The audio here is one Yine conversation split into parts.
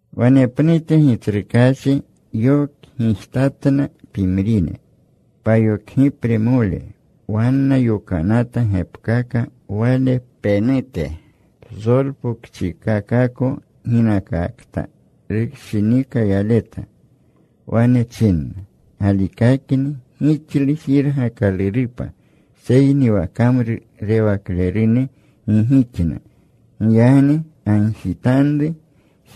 Wanepnute Gitsrukaachi yokgijtatna pimrine payokgipremole. Wanna yokanata gepkaka Wale penute psolpokchikakako ginakakta rushinika yaleta. Wane chinna, “Galikakni gixlu jirgakalurupa. Seyni wa kamrurewaklerune gi gixna. Giyagni gagjitanru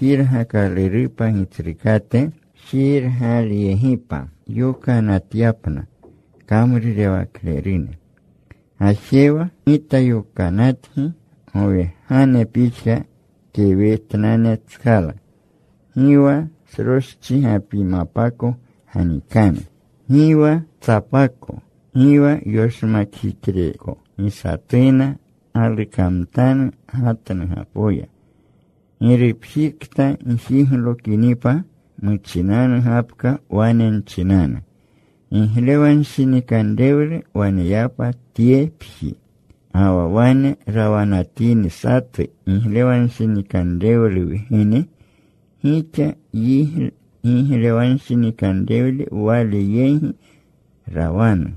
jirgakalurupa Gitsrukate jirgalyegipa yokanatyapna kamrurewaklerune. Gajewa. Gita yokanatgi gowegane pixka kewetnanetskala. Gi wa sroschigapimapa ganikanu, gi wa tsapako, gi wa yoshmakjixreko. Gi satuna galukamtanu gatnugapoya. “Girupjikokta gjiglokinipa, muchinanu gapka wane nchinanu, ‘Giglewanshinikanrewlu wanepa tyepji.’ Ga wa wane rawanatini satu giglewanshinikanrewlu wgene, gixa giglewanshinikanre wale yegi rawanu.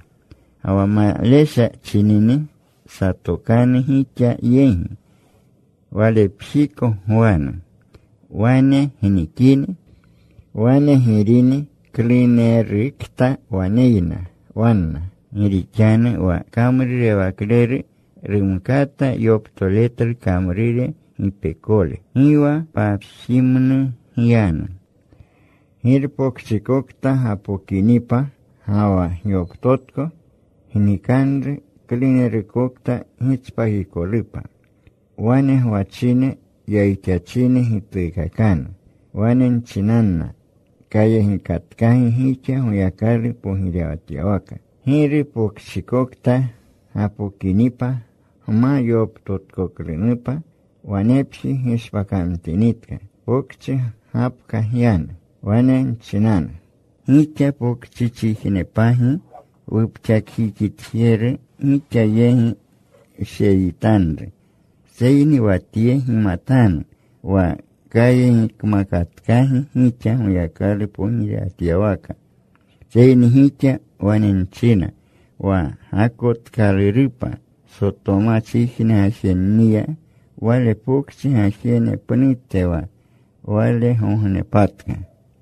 Ga wa malesha chinini, satokanu gixa yegi. Walepjiko gwanu. Wane gnikini. Wane girini klunerukta waneyna wanna. Gi rixanu wa kamrurewakleru rumkata yoptoletlu kamrure gipekole. Gi wa papjimnu gyanu. Girpokchikokta gapokinipa ga wa gyoptotko, gnikanru klunerukokta gitspakikolupa. Wane gwachine yayixachine gituukakanu. Wane nchinanna, ‘Kayegikatkagi gixa Goyakalu pogirewatyawaka.’ “Giru pokchikokta gapokinipa, gma yoptotkoklunupa, wanepji gishpakamtinitka, pokchi gapka gyanu. Wane nchinanu, ‘Gixa pokchichijnepagi wupxakjixitjeru gixa yegi wsheyitanru. Seyni wa tye gimatanu, wa kayegikmakatkagi gixa Goyakalu pogirewatyawaka.’ Seyni gixa wane nchina, wa gakotkalurupa Sotomachijne gajenniya wale pokchi gajene pnute wa walegognepatka.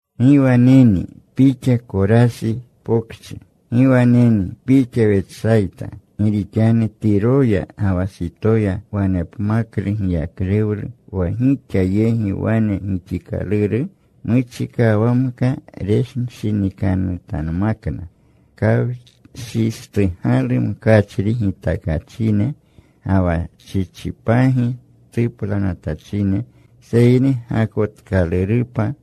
“¡Gi waneni pixa Korasi Pokchi! ¡Gi waneni pixa Wetsayta! Gi rixanu Tiroya ga wa Sitoya wanepmaklu giyaklewlu wa gixa yegi wane gixikaluru, muchikawamka renshinikanutanmakna kawshistugalu mkachri gitakachine, ga wa chichipagi tuplanatachine. Seyni gakotkalurupa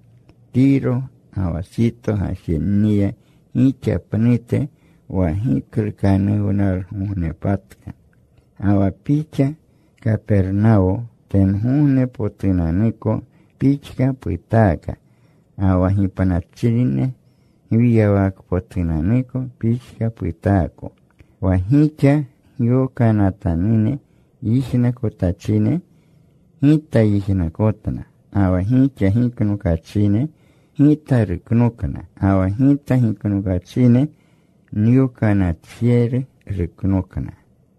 Tiro ga wa Sito gajenniya gixa pnute wa giklukanuwnalgognepatka. Ga wa pixa, Kapernawo, tengognepotunanuko pixka putaaka. Ga wa gipnachine gwiywakpotunanuko pixka putaako. Wa gixa nyokanatanune yijnakotachine, Gita yijnakotna. Ga wa gixa giknokachine, Gita ruknokna. Ga wa Gita giknokachine, nyokanatjeru ruknokna.”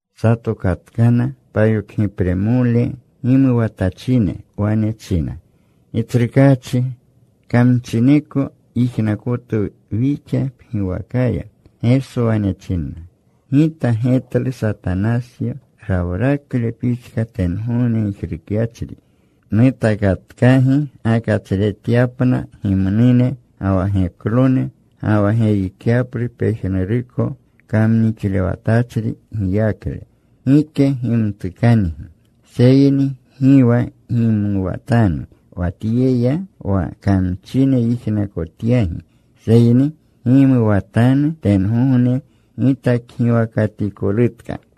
Satokatkana payokgipremolene. Gimuwatachine. Wane chinna, “Gitsrukaachi, kamchineko yijnakotwu wixa pgiwakaya.” Geso wane chinna, “Gita getlu Satanasyo rawrakle pixka tengogne gijrukyachri. Nutakatkagi gakatsretyapna gimnune ga wa geklone, ga wa geyikyaplu pejnuruko kamnixlewatachri giyakle. Gike gimtukangi. Seyni gi wa gimuwatanu wa tyeya wa kamchine yijnakotyagi, seyni gimuwatanu tengogne gitakgiwakatikolutka.”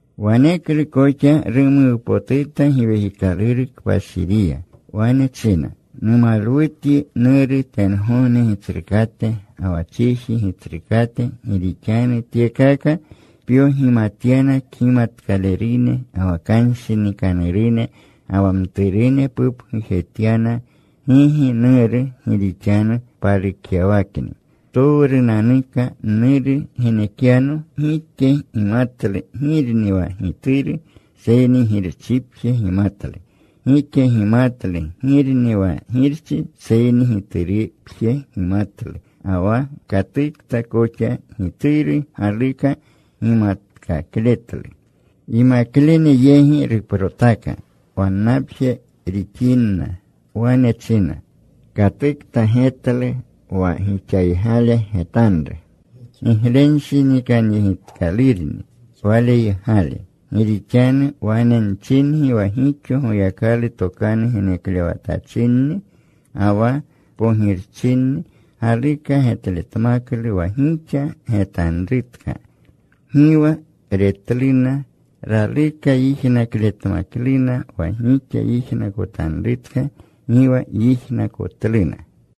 Waneklu koxa rumuwpotuta Giwekikaluru Kpashiriya. Wane china, “Numalwutyi, Nuru, tengogne Gitsrukate ga wa chiji Gitsrukate. Gi rixanu tyekaka pyogimatyana kgimatkalerune ga wa kanshinikanerune. Ga wa mturune pupgujetyana. Gigi, Nuru, gi rixanu palukyawakni. “Ptowrunanuka Nuru genekyano. Gike gimatlu girni wa Gituru seyni Girchipje gimatlu. Gike gimatlu girni wa Girchi, seyni Giturupje gimatlu ga wa katukta koxa Gituru galuka gimatkakletlu.” Yimaklene yegi ruprotaka, wannapje rixinna. Wane china, “Katukta getlu wa gixaygale getanru, giglenshinikanyegitkalurni waleygale. Gi rixanu wane nchingi wa gixo Goyakalu tokanu geneklewatachinni ga wa pogirchinni galuka getletmaklu wa gixa getanrutka. Gi wa retluna. Raluka yijnakletmakluna wa gixa yijnakotanrutka. Gi wa yijnakotluna.”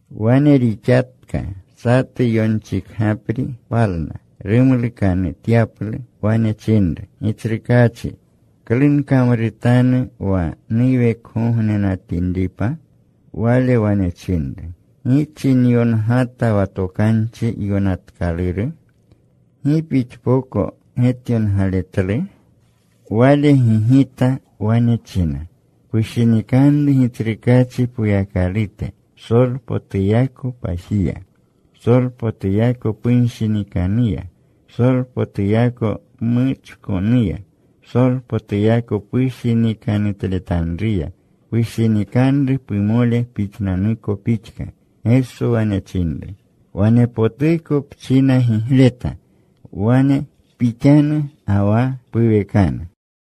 Wane rixaka. Satu yonchikgapri palna rumlukanutyaplu. Wane chinru, “Gitsrukaachi, ¿klu nkamrutanu wa nuwekgognenatinripa?” Wale wane chinru, “¿Gi china yongata wa Tokanchi Yokanatkaluru? ¿Gi pixpoko getyongaletlu?” Wale gigita. Wane china, “Pushinikanru Gitsrukaachi Poyakalute psolpotuyako pajiya, psolpotuyako punshinikanuya, psolpotuyako pmuchkonuya, psolpotuyako pushinikanutletanruya. Pushinikanru pumole pixnanuko pixka.” Geso wane chinru, “Wane potuko pchina gigleta. Wane pixanu ga wa puwekanu.”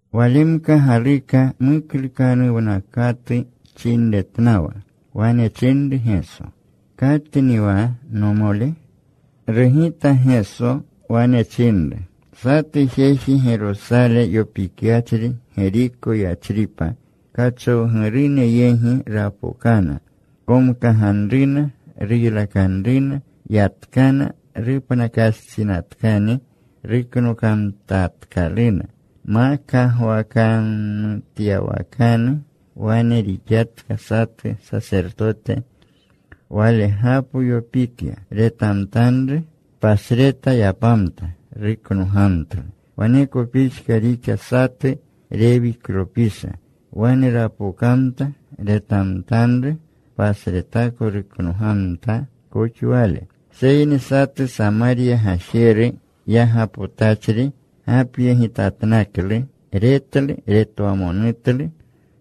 Walemka galuka muklukanuwnakatu chinretnawa. Wane chinru Geso, “¿Katni wa nomole?” Rugita Geso. Wane chinru, “Satu jeji Gerosale yopikyachri Geriko yachripa kachowgurune yegi rapokana. Komkaganruna. Ruylakanruna. Yatkana. Rupnakastsinatkani ruknokamtatkaluna. Ma kagwakamtyawakanu wane rixatka. Satu sasertote walegapo yopikya. Retamtanru. Pasreta yapamta. Ruknogamtlu. Waneko pixka rixa satu Rewiklopisha. Wane rapokamta. Retamtanru. Pasreta ruknogamta koxa wale. Seyni satu Samarya gajeru, yagapotachri gapyegitatnaklu. Retlu. Retwamonutlu.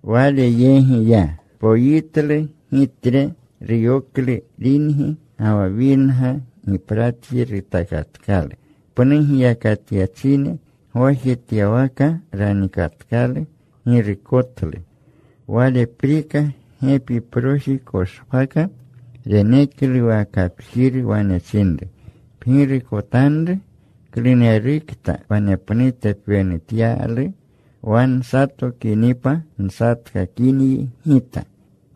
Wale yegi ya. Poyitlu gitre. Ruyoklu ringi ga wa winga. Gipratji rutakatkalu. Pnu giyakatyachine gwajetyawaka ranikatkalu. Girukotlu. Waleprika gepiproji koshpaka. Reneklu wa kapjiru. Wane chinru, ‘Pgirukotanru. Klunerukta wanepnute pwenutyalu, wa nsatokinipa nsatkakinyi gita.’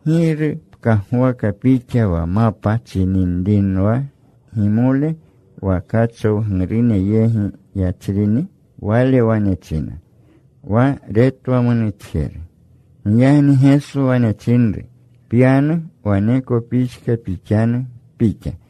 “¿Giru pkagwaka pixa wa mapa chininrinwa gimole wa kachowgurune yegi yachrini?” Wale wane china, “Wa retwamonutjeru.” Giyagni Geso wane chinru, “Pyanu. Waneko pixka pixanu pixa.”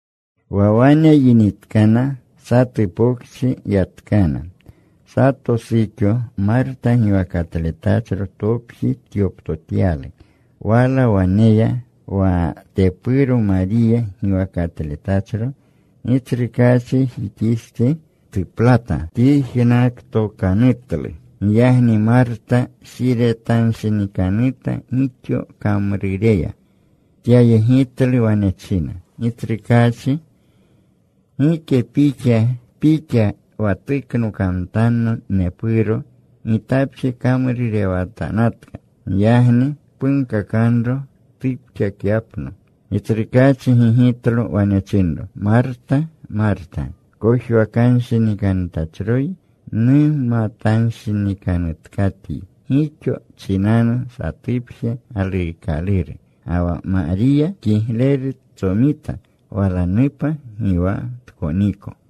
Wa wane yinitkana, satu pokchi yatkana. Sato suxo Marta giwakatletachro topji tyoptotyalu. Wala waneya wa tepuro. Mariya giwakatletachro. Gitsrukaachijixistsi tuplata. Tyijnaktokanutlu. Giyagni Marta shiretanshinikanuta gixo tkamrureya. Tapyegitlu. Wane china, “Gitsrukaachi, ¿gike pixa Pixa wa tuknokamtanno nepuro, gitapje nkamrurewatanatka? Giyagni punkakanro tupxakapyapno.” Gitsrukaachi gigitlo. Wane chinro, “Marta, Marta, kojwakanshinikanutachroyi, mumatanshinikanutkatyi gixo chinanu. Satupje galuukaluru. Ga wa Mariya kigleru tsomita walanupa. Gi wa tkoniko.”